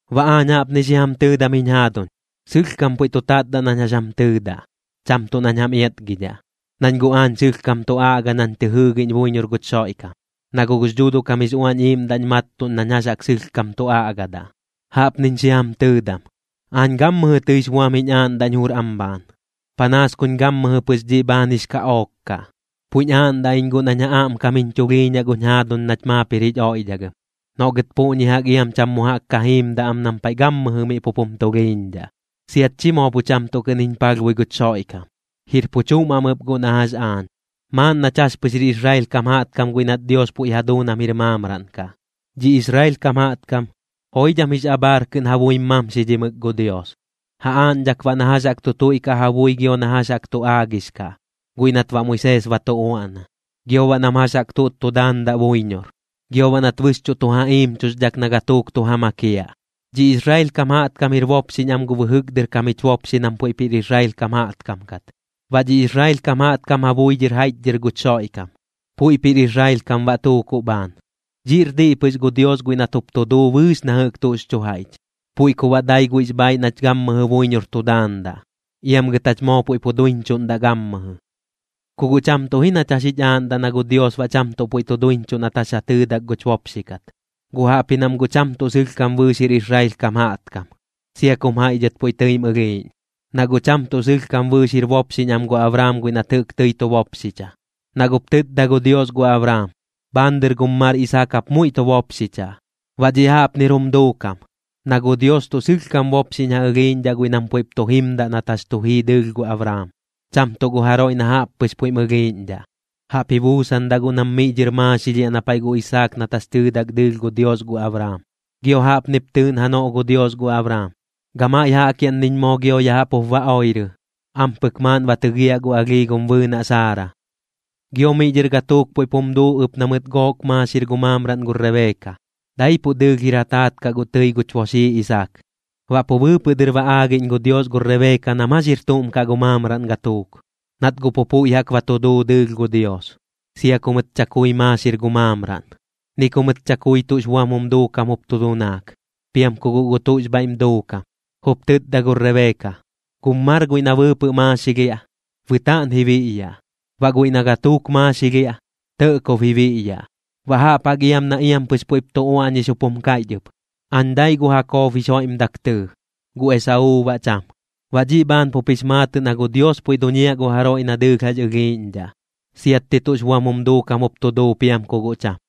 Baꞌ aañ jaꞌpni xi jam tɨɨdam jiñ jaaduñ, sɨlhkam puiꞌ tu tatdaꞌ nañ jax jam tɨɨdaꞌ, cham tuꞌ nañ jam iatgidhaꞌ, nañ guꞌ aañ sɨlhkam tu aꞌga nañ tɨ jɨɨgiꞌñ buiñor guch Xoiꞌkam, na guꞌ gux Dhuuduꞌ kam jix Uañ Iiꞌmdaꞌñ mattuꞌn nañ jax jaꞌk sɨlhkam tu aꞌgadaꞌ. Jaꞌpniñ xi jam tɨɨdam: Aañ gammɨjɨ tɨix buam jiñ aaꞌndaꞌñ jur am bhaan, panaas kuñ gammɨjɨ pɨx dhiꞌ bhaan jix kaꞌook kaꞌ. Puiꞌñ aaꞌndaꞌ iñ guꞌ nañ ja aꞌmkam jiñ chulhiiñaꞌ guñ jaaduñ nach maap jir jich oiꞌdhagɨm, noꞌ gɨt puꞌñi jaꞌk iam cham mu jaꞌk ka jiimdaꞌ am nam paiꞌ gammɨjɨ miꞌ pup jum tulhiiñdhaꞌ, siat chi moo pu cham tuꞌ kɨꞌn jiñ palhbui guch Xoiꞌkam. Jir pu chuꞌm am ɨp guꞌ na jax aañ, maaꞌn nach jax pɨx jir Israel kam jaꞌtkam guiꞌ nat Dios puiꞌ ja duu nam jir maamraꞌn kaꞌ. Dhi Israel kam jaꞌtkam, joidham jix abhaar kɨꞌn ja buim mamxidhimɨk gu Dios, ja aaꞌñdhak baꞌ na jax jaꞌk tu tuiꞌkaꞌ ja bui gio na jax jaꞌk tu aagix kaꞌ, guiꞌ nat baꞌ Moisees ba tu uaꞌna, gio baꞌ nam jax jaꞌk tuꞌt tu daandaꞌ buiñor, gio baꞌ nat bɨxchuꞌ tu ja iimchuxdhak na gatuuk tu ja makiaꞌ. Dhi Israel kam jaꞌtkam jir bopxiꞌñ am gu bɨjɨk dɨr kam jich bopxi nam puiꞌp jir Israel kam jaꞌtkam kat. Baꞌ dhi Israel kam jaꞌtkam ja bui dhɨr jaiꞌchdhɨr guch Xoiꞌkam, puiꞌp jir Israel kam baꞌ tuukuꞌ bhaan. Dhiꞌr diꞌ pɨx gu Dios guiꞌ nat jup tu duu bɨɨx na jɨꞌk tuꞌx chu jaiꞌch, puiꞌ ku baꞌ dai guiꞌx bhaiꞌ nach gammɨjɨ buiñor tu daandaꞌ, iam gɨt jach moo puiꞌ pu duiñchuꞌndaꞌ gammɨjɨ. Ku guꞌ cham tuꞌ ji nach jax jich aaꞌndaꞌ na gu Dios baꞌ cham puiꞌ tu duiñchuꞌ nat jax ja tɨɨdak guch bopxi kat, guꞌ jaꞌpji nam guꞌ cham tuꞌ sɨlhkam bɨɨx jir Israel kam jaꞌtkam, sia kum jaiꞌ dhɨt puiꞌ tɨim ɨlhiiꞌñ. Na guꞌ cham tuꞌ sɨlhkam bɨɨx jir bopxiꞌñ am gu Abraam guiꞌ nat jɨꞌk tɨi tu bopxicha, na guꞌp tɨtda gu Dios gu Abraam: “Bhaan dɨr gum mar Isaak jap muiꞌ tu bopxichaꞌ.” Baꞌ dhiꞌ jaꞌpnir jum duukam, na gu Dios tuꞌ sɨlhkam bopxiꞌñ ja ɨlhiiꞌñdhaꞌ guiꞌ nam puiꞌp tu jimdaꞌ nat jax tu jii dɨɨlh gu Abraam, cham tuꞌ gu jaroiꞌ na jaꞌp pɨx puiꞌm ɨlhiiꞌñdhaꞌ. Jaꞌp ji buusandaꞌ guꞌ nam miꞌ dhɨr maaxilhiaꞌ na paiꞌ gu Isaak nat jax tɨɨdak dɨɨlh gu Dios gu Abraam. Gio jaꞌpnip tɨɨꞌn janoꞌ gu Dios gu Abraam: “Gamaiꞌ jaꞌkiaꞌnniñ moo gio ya jaꞌp jup ba oirɨ, ampɨk maaꞌn ba tɨgiaꞌ gu alhii gum bɨɨnaꞌ Saara.” Gio miꞌ dhɨr gatuuk puiꞌp jum duu ɨp na mɨt gook maaxir gu maamraꞌn gu Rebeeka, daipuꞌ dɨɨlh jir ja taat kaꞌ guꞌ tɨi guch boxii Isaak. Baꞌ pu bɨɨpɨꞌ dɨr ba aagiꞌñ gu Dios gu Rebeeka nam jax jir tuꞌm kaꞌ gu maamraꞌn gatuuk, nat guꞌ pu puiꞌ jaꞌk ba tu duu dɨɨlh gu Dios, sia ku mɨt chakui maaxir gu maamraꞌn, ni ku mɨt chakui tuꞌx buam jum duukam jup tu dunaak, piam ku guꞌ gu tuꞌx bhaiꞌm duukam. Jup tɨtda gu Rebeeka: “Gum mar guiꞌ na bɨɨpɨꞌ maaxilhiaꞌ, bɨtaaꞌn ji biꞌyaꞌ, baꞌ guiꞌ na gatuuk maaxilhiaꞌ, tɇꞌkob ji biꞌyaꞌ.” Baꞌ jaꞌp jaꞌk iam na iam pɨx puiꞌp tu uaꞌñix jup jum kaiꞌch ɨp: “Aañ dai gu Jakob jix joiꞌmdak tɨɨ, gu Esauu baꞌ cham.” Baꞌ dhiꞌ bhaan pup jix maatɨꞌ na gu Dios puiꞌ duñiaꞌ gu jaroiꞌ na dɨɨlh jax ɨlhiiꞌñdhaꞌ, siatti tuꞌx buam jum duukam jup tu duu piam ku guꞌ cham.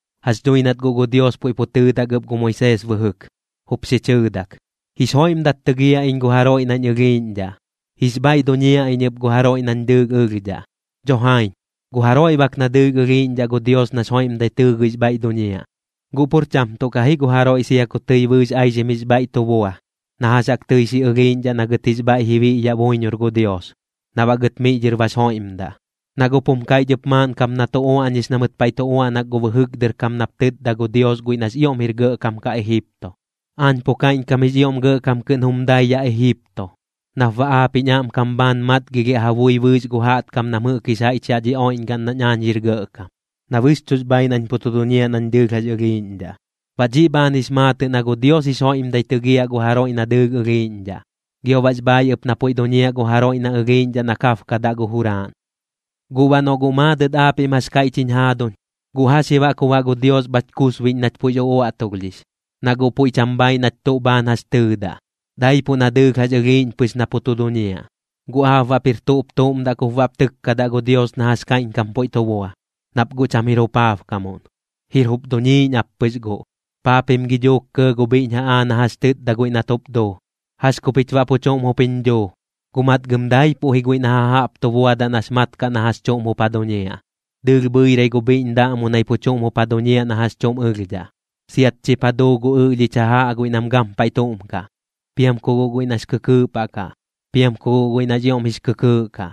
Jax dhui nat guꞌ gu Dios puiꞌ pu tɨɨdak ɨp gu Moisees bɨjɨk, jup xi chɨɨdak: “Jix joiꞌmdat tɨgiaꞌ iñ gu jaroiꞌ nañ ɨlhiiꞌñdhaꞌ. Jix bhaiꞌ duñiaꞌ iñ ɨp gu jaroiꞌ nañ dɨɨlh ɨlhdhaꞌ.” Dho jaiñ, gu jaroiꞌ bak na dɨɨlh ɨlhiiꞌñdhaꞌ gu Dios nax joiꞌmdai tɨɨgɨix bhaiꞌ duñiaꞌ, guꞌ pur cham tuꞌ kaꞌ ji gu jaroiꞌ sia ku tɨi bɨɨx aixim jix bhaiꞌ tu bua, na jax jaꞌk tɨi xi ɨlhiiꞌñdhaꞌ na gɨt jix bhaiꞌ ji biꞌyaꞌ buiñor gu Dios, na baꞌ gɨt miꞌ dhɨr bax joiꞌmdaꞌ. Na guꞌp jum kaiꞌch ɨp maaꞌn kap na tu uaꞌñix na mɨt paiꞌ tu uaꞌnak gu bɨjɨk dɨr kam nap tɨtda gu Dios guiꞌ nax ioꞌm jir gɇꞌkam kaꞌ Ejipto: “Aañ pu kaiꞌñkam jix ioꞌm gɇꞌkam kɨꞌn jum dai yaꞌ Ejipto, nap baꞌ aap jiñ aꞌmkam bhaan matgilhiaꞌ ja bui bɨɨx gu jaꞌtkam nam jɨꞌk jix jaiꞌch yaꞌ dhi oiꞌñgaꞌn nañ jax jir gɇꞌkam, na bɨxchuꞌx bhaaiꞌ nañ pu tu duñiaꞌ nañ dɨɨlh jax ɨlhiiꞌñdhaꞌ.” Baꞌ dhiꞌ bhaan jix maatɨꞌ na gu Dios jix joiꞌmdai tɨgiaꞌ gu jaroiꞌ na dɨɨlh ɨlhiiꞌñdhaꞌ, gio baꞌx bhaaiꞌ ɨp na puiꞌ duñiaꞌ gu jaroiꞌ na ɨlhiiꞌñdhaꞌ na kabkadaꞌ gu juraaꞌn. Guꞌ baꞌ noꞌ guꞌ maadɨt aapiꞌm jax kaiꞌch jiñ jaaduñ: “¿Guꞌ jax ji baꞌ ku baꞌ gu Dios bhach kusbiꞌñ nach puiꞌx uꞌuaꞌtulhdhix, na guꞌ puiꞌ cham bhaaiꞌ nach tuꞌ bhaan jax chɨɨdaꞌ, daipuꞌ na dɨɨlh jax ɨlhiiꞌñ pɨx na pu tu duñiaꞌ?” ¿Guꞌ aap baꞌp jir tuꞌp tuꞌm daꞌ kup baꞌp tɨkkadaꞌ gu Dios na jax kaiꞌñkam puiꞌ tu bua, nap guꞌ cham jir jupaabkamuꞌn? Jir jup duñiiꞌñ ap pɨx guꞌ. Paa pim gi duuk kɇɇ gu bhiꞌñ jaꞌaa na jax tɨtda guiꞌ nat jup duu: “¿Jax ku pich baꞌ pu chuꞌm jup jiñ dhuu?” Guꞌ matgɨm daipuꞌ ji guiꞌ na jajaꞌp tu buadaꞌ nax mat kaꞌ na jax chuꞌm jup ja duñiaꞌ. Dɨɨlh bhɨirai gu bhiꞌñ daꞌmunai pu chuꞌm jup ja duñiaꞌ na jax chuꞌm ɨlhdhaꞌ, siat chip ja duu gu ɨꞌlhich jajaꞌ guiꞌ na gampaiꞌ tuꞌm kaꞌ, piam ku guꞌ guiꞌ nax kɨkɨɨꞌ paꞌ kaꞌ, piam ku guꞌ guiꞌ nax ioꞌm jix kɨkɨɨꞌ kaꞌ.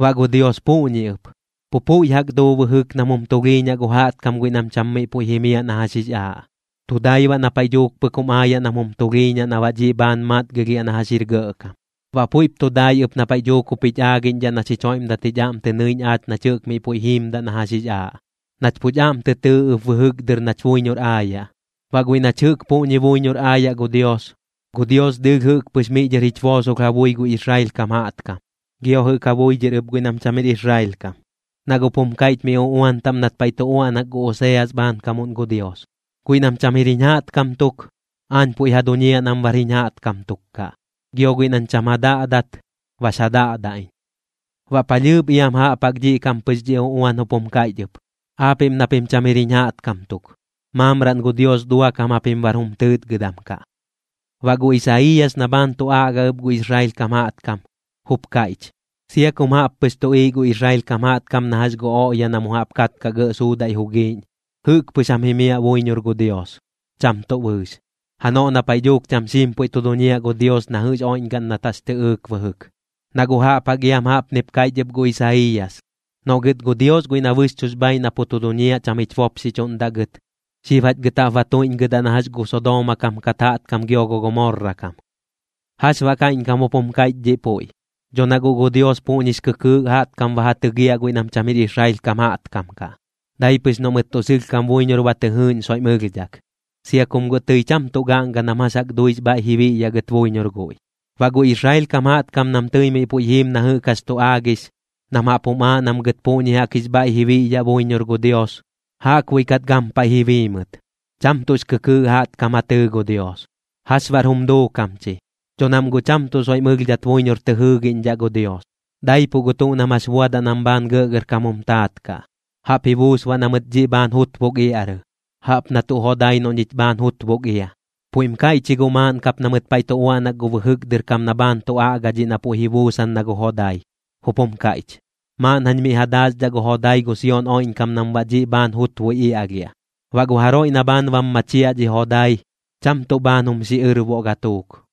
Baꞌ gu Dios puꞌñi ɨp, pu puiꞌ jaꞌk duu bɨjɨk nam jum tulhiiñaꞌ gu jaꞌtkam guiꞌ nam cham miꞌ puiꞌ jimiaꞌ na jax jix aaꞌ, tu dai baꞌ na paiꞌ dhuuk pɨk jum aayaꞌ nam jum tulhiiñaꞌ na baꞌ dhiꞌ bhaan matgilhiaꞌ na jax jir gɇꞌkam. Baꞌ puiꞌp tu dai ɨp na paiꞌ dhuuk jup jich aagiꞌñdhaꞌ na xich joiꞌmdat jich aꞌm tɨ nɨiꞌñ aach nach jɨꞌk miꞌ puiꞌ jiimdaꞌ na jax jix aaꞌ, nat puch aꞌm tɨ tɨɨ ɨp bɨjɨk dɨr nach buiñor aayaꞌ. Baꞌ guiꞌ nach jɨꞌk puꞌñi buiñor aayaꞌ gu Dios, gu Dios dɨɨlh jɨꞌk pɨx miꞌ dhɨr jich boosolh ja bui gu Israel kam jaꞌtkam, gio jɨꞌk ja bui dhɨr ɨp guiꞌ nam cham jir Israel kam. Na guꞌp jum kaiꞌch miꞌ uꞌuan taꞌm nat paiꞌ tu uaꞌnak gu Oseas bhaankamuꞌn gu Dios: Guiꞌ nam cham jir jiñ jaꞌtkam tuk, aañ puiꞌ ja duñiaꞌ nam bar jiñ jaꞌtkam tuk kaꞌ. Gio guiꞌ nañ cham ja daꞌdat, bax ja daꞌdaꞌ iñ. Baꞌ palhɨɨp iam jaꞌp jaꞌk dhiꞌ kaꞌm pɨx dhi uꞌuan jup jum kaiꞌch ɨp: Aapiꞌm na pim cham jir jiñ jaꞌtkam tuk, maamraꞌn gu Dios duakam japim bar jum tɨɨtgɨdam kaꞌ. Baꞌ gu Isaiiyas na bhaan tu aꞌga ɨp gu Israel kam jaꞌtkam, jup kaiꞌch: “Sia kum jaꞌp pɨx tuꞌiiꞌ gu Israel kam jaꞌtkam na jax gu oꞌya na mu jaꞌp katkaꞌ gɇꞌ suudaiꞌ jugiiꞌñ, jɨꞌk pɨx jam jimiaꞌ buiñor gu Dios, cham tuꞌ bɨɨx, janoꞌ na paiꞌ dhuuk cham xiim puiꞌ tu duñiaꞌ gu Dios na jɨꞌx oiꞌñgaꞌn nat jax tɨꞌɨɨk bɨjɨk.” Na guꞌ jaꞌp jaꞌk iam jaꞌpnip kaiꞌch ɨp gu Isaiiyas: Noꞌ gɨt gu Dios guiꞌ na bɨxchuꞌx bhaaiꞌ na pu tu duñiaꞌ cham jich bopxichuꞌndaꞌ gɨt, xib jach gɨt jaꞌp ba tuiꞌñgɨdaꞌ na jax gu Sodooma kam kat jaꞌtkam gio gu Gomorra kam. ¿Jax baꞌ kaiꞌñkam jup jum kaiꞌch dhiꞌ puiꞌ? Dho na guꞌ gu Dios puꞌñix kɨkɨɨꞌ jaꞌtkam ba ja tɨgiaꞌ guiꞌ nam cham jir Israel kam jaꞌtkam kaꞌ, dai pɨx noꞌ mɨt tuꞌ sɨlhkam buiñor ba tɨ jɨɨꞌñ soiꞌm ɨlhdhak, sia kum guꞌ tɨi cham tuꞌ gaꞌnga nam jax jaꞌk duix bhaiꞌ ji biꞌyaꞌ gɨt buiñor guiꞌ. Baꞌ gu Israel kam jaꞌtkam nam tɨi miꞌ puiꞌ jiim na jɨꞌk jax tu aagix, nam jaꞌp jum aaꞌ nam gɨt puꞌñi jaꞌk jix bhaiꞌ ji biꞌyaꞌ buiñor gu Dios, jaꞌkbuiꞌ kat gampaiꞌ ji bii mɨt. Cham tuꞌx kɨkɨɨꞌ jaꞌtkam ja tɨɨ gu Dios. ¿Jax baꞌr jum duukam chi? Dho nam guꞌ cham tuꞌ soiꞌm ɨlhdhat buiñor tɨ jɨɨgiꞌñdhaꞌ gu Dios, daipuꞌ gu tuꞌ nam jax buadaꞌ nam bhaan gɇꞌgɇrkam jum taat kaꞌ. Jaꞌp ji buus baꞌ na mɨt dhiꞌ bhaan jutbuk iaꞌrɨ, jaꞌp na tuꞌ jodai noꞌ ñich bhaan jutbuk ia. Puiꞌm kaiꞌch ji guꞌ maaꞌn kap na mɨt paiꞌ tu uaꞌnak gu bɨjɨk dɨr kam na bhaan tu aꞌga dhiꞌ na puiꞌ ji buusan na gu jodai, jup jum kaiꞌch: Maaꞌn jañ miꞌ ja daaxdhaꞌ gu jodai gu Sion oiꞌñkam nam baꞌ dhiꞌ bhaan jutbui iaꞌlhiaꞌ. Baꞌ gu jaroiꞌ na bhaan bam machiaꞌ dhi jodai, cham tuꞌ bhaan jum xiꞌɨrboꞌ gatuuk.